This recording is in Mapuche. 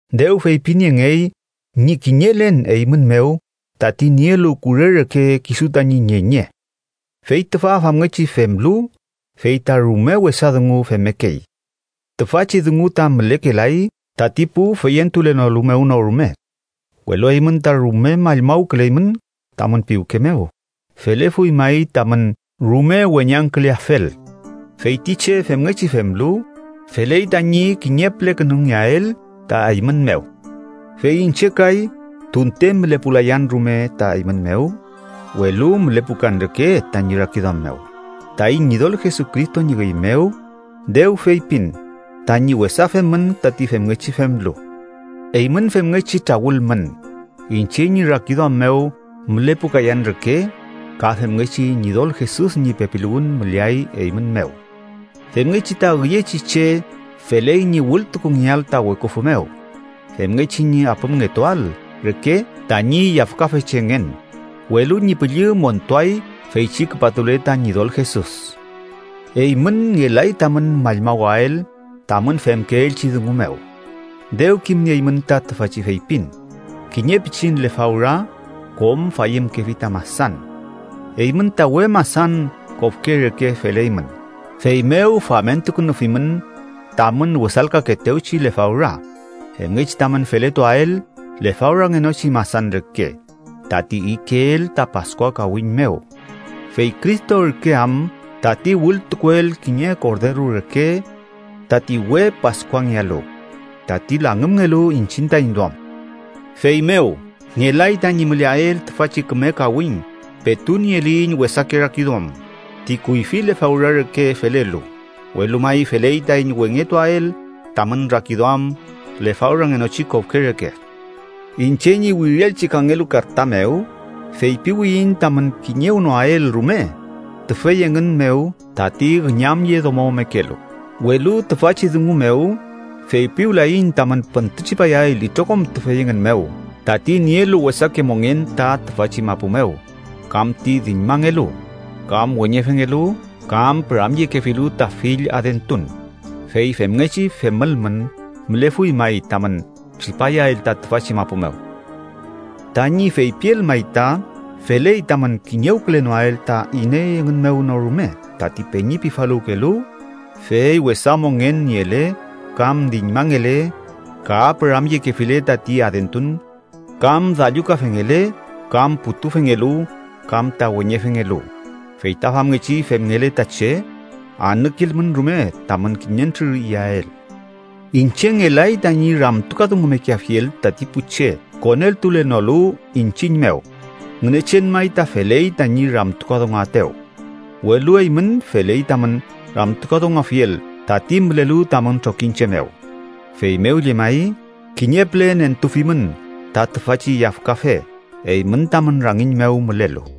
Dew feypiniengey ñi kiñelen eymün mew tati nielu kure reke kisu tañi ñeñe. Fey tüfa famngechi femlu, fey ta rume wesa dungu femmekey. Tüfachi dungu ta mülekelay tati pu feyentulenolu mew no rume. ¡Welu eymün ta rume mallmawküleymün tamün piwke mew! ¡Felefuy may tamün rume weñangküleafel! Fey ti che femngechi femlu, feley tañi kiñe pülekünungeael ta eymün mew. Fey iñche kay, tunte mülepulayan rume ta eymün mew, welu mülepukan reke tañi rakiduam mew. Taiñ Ñidol Jesucristo ñi üy mew, dew feypin tañi wesa femün tati femngechi femlu. Eymün femngechi trawülmün, iñche ñi rakiduam mew mülepukayan reke ka femngechi Ñidol Jesus ñi pepiluwün müleay eymün mew. Femngechi ta üyechi che feley ñi wültukungeael ta weküfü mew, femngechi ñi apümngetuael reke tañi yafkafechengen, welu ñi püllü montuay feychi küpatule ta Ñidol Jesus. Eymün ngelay tamün mallmawael tamün femkeelchi dungu mew. Dew kimnieymün ta tüfachi feypin: “Kiñe pichin lefawra kom fayümkefi ta masan.” Eymün ta we masan kofke reke feleymün, feymew famentukünufimün tamün wesalkaetewchi lefawra, femngechi tamün feletuael lefawrangenochi masan reke, tati ikeel ta Paskua kawiñ mew. Fey Cristo ürke am tati wültukuel kiñe korderu reke tati we Paskuangealu, tati langümngelu iñchiñ taiñ duam. Feymew ngelay tañi müleael tüfachi küme kawiñ petu nieliyiñ wesake rakiduam ti kuyfi lefawra reke felelu, welu may feley tañi wengetuael tamün rakiduam lefawrangenochi kofke reke. Iñche ñi wirielchi kangelu karta mew feypiwiyiñ tamün kiñewnoael rume tüfey engün mew tati üñamyedomomekelu, welu tüfachi dungu mew feypiwlayiñ tamün püntütripayael itrokom tüfey engün mew tati nielu wesake mongen ta tüfachi mapu mew, kam ti diñmangelu, kam weñefengelu, kam püramyekefilu ta fill adentun, fey femngechi femülmün mülefuy may tamün tripayael ta tüfachi mapu mew. Tañi feypiel may ta feley tamün kiñewkülenoael ta iney engün mew no rume tati peñi pifaluwkelu, fey wesa mongen niele kam diñmangele, ka püramyekefile tati adentun, kam dallukafengele, kam putufengelu, kam ta weñefengelu. Fey ta famngechi femngele ta che, anükilmün rume tamün kiñentrür iyael. Iñche ngelay tañi ramtukadungumekeafiel tati pu che koneltulenolu iñchiñ mew. Ngünechen may ta feley tañi ramtukadunguaetew. Welu eymün feley tamün ramtukadunguafiel tati mülelu tamün trokiñche mew. Feymew llemay kiñe püle nentufimün ta tüfachi yafkafe eymün tamün rangiñ mew mülelu.